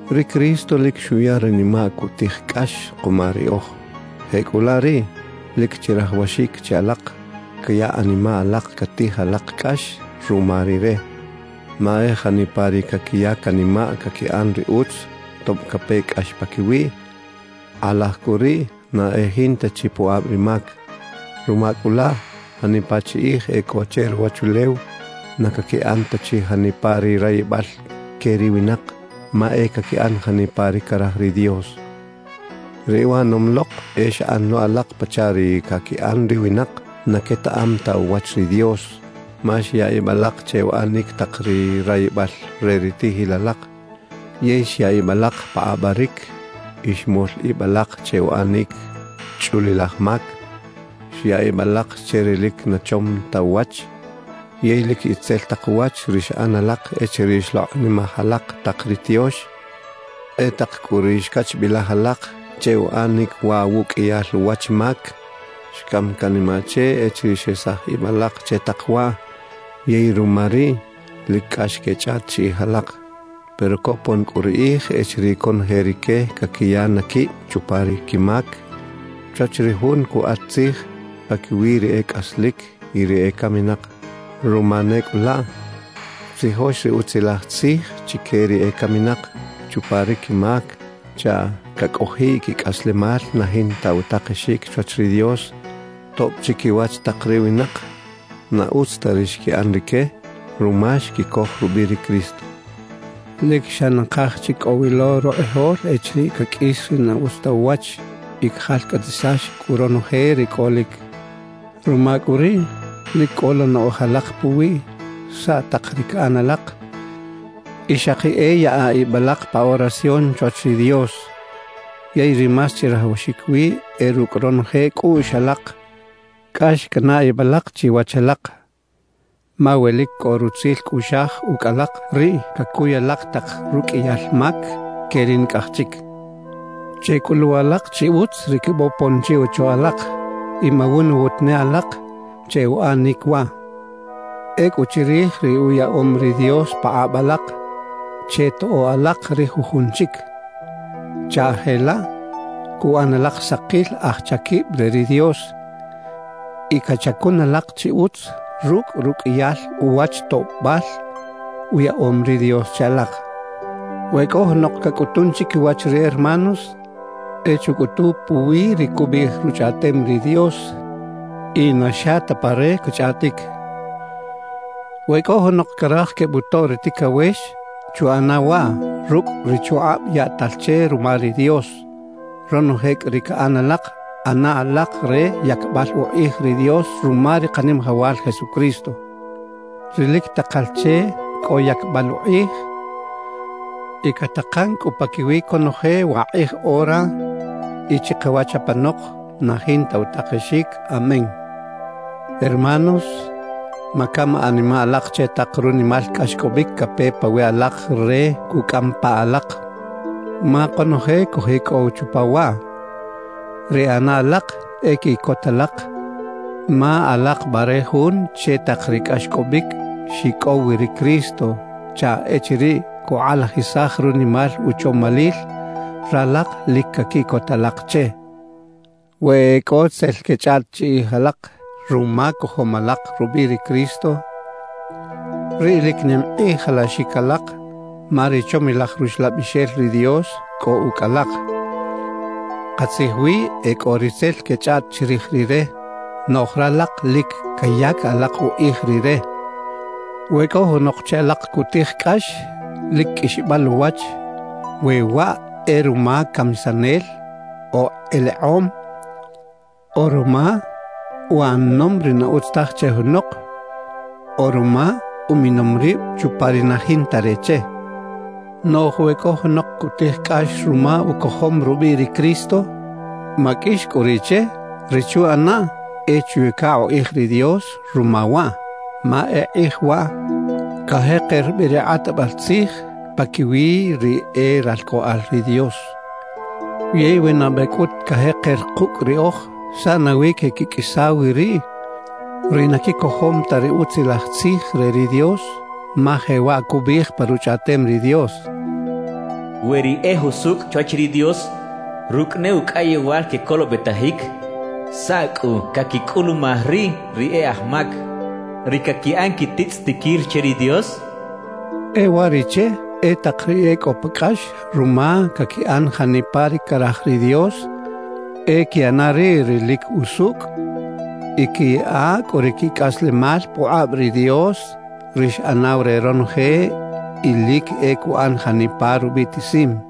Ri Cristo lic xuya ranimaꞌ cutij cꞌax kuma riꞌoj. Jecꞌulaꞌ riꞌ, lic chirajawaxic che alak caya animaꞌ alak catij alak cꞌax ruma Rire. Ma e janipa ri caquiya canimaꞌ caquiꞌan ri utz tob cape cꞌax paquiwiꞌ, kꞌalaj cꞌu riꞌ na e jinta chi pukꞌab ri mac. Ruma cꞌu laꞌ, janipa chi kꞌij e cꞌo che ruwachulew, na caquiꞌan ta chi janipa ri rayibal que ri winak, ma e caquiꞌan janipa ri caraj ri Dios. Ri uꞌanom lok e xꞌan lo alak pachaꞌ ri caquiꞌan ri winak na quetaꞌam ta uwach ri Dios. Ma xya ib alak che uꞌanic tak ri rayibal re ri tiꞌjil alak, yey xya ib alak pa kꞌabaric y xmol ib alak che uꞌanic chꞌulilaj mac; xya ib alak che ri lic na chom ta uwach yey lic itzel tak uwach ri xꞌan alak echiriꞌ xlokꞌnimaj alak tak ri tiox. E tak cꞌu ri xcachbilaj alak che uꞌanic waꞌ wuꞌqꞌuiyal uwach mac, xcam canimaꞌ che echiriꞌ xesaj ib alak che tak waꞌ; yey ruma riꞌ lic cꞌax quechꞌaꞌt chiꞌij alak. Pero copon cꞌu ri kꞌij echiriꞌ conoje rique caquiya na quib chupa ri quimac chwach ri Jun cukꞌat tzij paquiwi ri e cꞌaslic y ri ecaminak. Ruma ne cꞌu laꞌ, xtzijox ri Utzilaj Tzij chique ri ecaminak chupa ri quimac chaꞌ cacꞌojiꞌ quicꞌaslemal na jinta utakexic chwach ri Dios, tob chiquiwach tak ri winak, na utz ta ri xquiꞌan rique ruma xquicoj rubiꞌ ri Cristo. Lic xa nakaj chi cꞌo wi lo rukꞌijol echiriꞌ caqꞌuis ri na utz ta uwach y cajalcꞌatisax cꞌu ronoje ri cꞌolic. Ruma cꞌu riꞌ, lic cꞌola naꞌoj alak puwiꞌ saꞌ tak ri caꞌan alak y xaki e yaꞌa ib alak pa oración chwach ri Dios. Yey ri más chirajawaxic wi e rucꞌ ronoje cꞌuꞌx alak cꞌax canaꞌ ib alak chiwach alak, ma we lic cꞌo rutzil cꞌuꞌxaj ucꞌ alak, riꞌ cacuy alak tak ruqꞌuiyal mac que ri nicꞌaj chic. Checꞌulu alak chi utz ri quebopon chi ocho alak y mawunwut ne alak che uꞌanic waꞌ. Ecꞌu chirij ri uyaꞌom ri Dios pakꞌab alak, chetoꞌo alak ri jujun chic, chaꞌ jelaꞌ cuꞌan alak sakil aj chaquib re ri Dios y cachacun alak chi utz rucꞌ ruqꞌuiyal uwach toꞌbal uyaꞌom ri Dios che alak. We cꞌo junok cacꞌutun chiquiwach ri hermanos, e chucꞌutu puwi ri cubiꞌij Ruchꞌaꞌtem ri Dios y na xa ta pa re cachꞌaꞌtic. We cꞌo junok caraj quebutoꞌ ri ticawex, chuꞌana waꞌ rucꞌ ri chukꞌab yaꞌtal che ruma ri Dios. Ronoje cꞌu ri caꞌan alak, ꞌana alak re yacbal ukꞌij ri Dios ruma ri Kanimajawal Jesucristo, ri lic takal che cꞌo yacbal ukꞌij y catakan cꞌu paquiwi conoje wakꞌij ora y chikawach apanok na jinta utakexic. Amén. Hermanos, macam animaꞌ alak che tak runimal cꞌaxcꞌobic cape pawiꞌ alak re cucꞌam pa alak, ma konoje cojicꞌow chupa waꞌ. Ri ꞌana alak e quiꞌcota alak, ma alak bare jun che tak ri cꞌaxcꞌobic xicꞌow wi ri Cristo, chaꞌ echiriꞌ cukꞌalajisaj runimal uchomalil, ralak lic caquiꞌcot alak che. We e cꞌo tzel quechꞌaꞌt chiꞌij alak ruma cojom alak rubiꞌ ri Cristo, riꞌ lic nim kꞌij alaxic alak ma ri chomilaj Ruxlabixel ri Dios cꞌo ucꞌ alak. Katzij wi, e cꞌo ri tzel quechꞌaꞌt chirij Rire, noꞌj ralak lic cayac alak ukꞌij Rire. We cꞌo junok che alak cutij cꞌax, lic qꞌuixbal uwach we waꞌ e ruma camisanel o elekꞌom o ruma uꞌanom ri na utz taj che junok o ruma uminom rib chupa ri na jinta re che. Noꞌj we cꞌo junok cutij cꞌax ruma ucojom rubiꞌ ri Cristo, maqꞌuix cꞌu riꞌ che; ri chuꞌanaꞌ e chuyaca ukꞌij ri Dios ruma waꞌ. Ma e kꞌij waꞌ cajeker bi ri kꞌatbal tzij paquiwi ri e ralcꞌoꞌal ri Dios. Yey we nabe cꞌut cajeker kucꞌ riꞌoj, ¿saꞌ nawi queꞌquiqꞌuisa wi riꞌ ri na quicojom ta ri Utzilaj Tzij re ri Dios? Ma jewaꞌ cubiꞌij pa Ruchꞌaꞌtem ri Dios: We ri e jusucꞌ chwach ri Dios rucꞌ ne ucꞌayewal quecolobetajic, ¿saꞌ cꞌu caquicꞌulumaj riꞌ ri e aj mac, ri caquiꞌan quititzꞌitiquil che ri Dios? E uwariꞌche, e tak ri e cꞌo pa cꞌax ruma caquiꞌan janipa ri caraj ri Dios, e quiꞌana riꞌ ri lic usucꞌ y quiyaꞌa cꞌu ri quicꞌaslemal pukꞌab ri Dios, ri xꞌanaw re ronoje y lic e cuꞌan janipa rubiꞌtisim.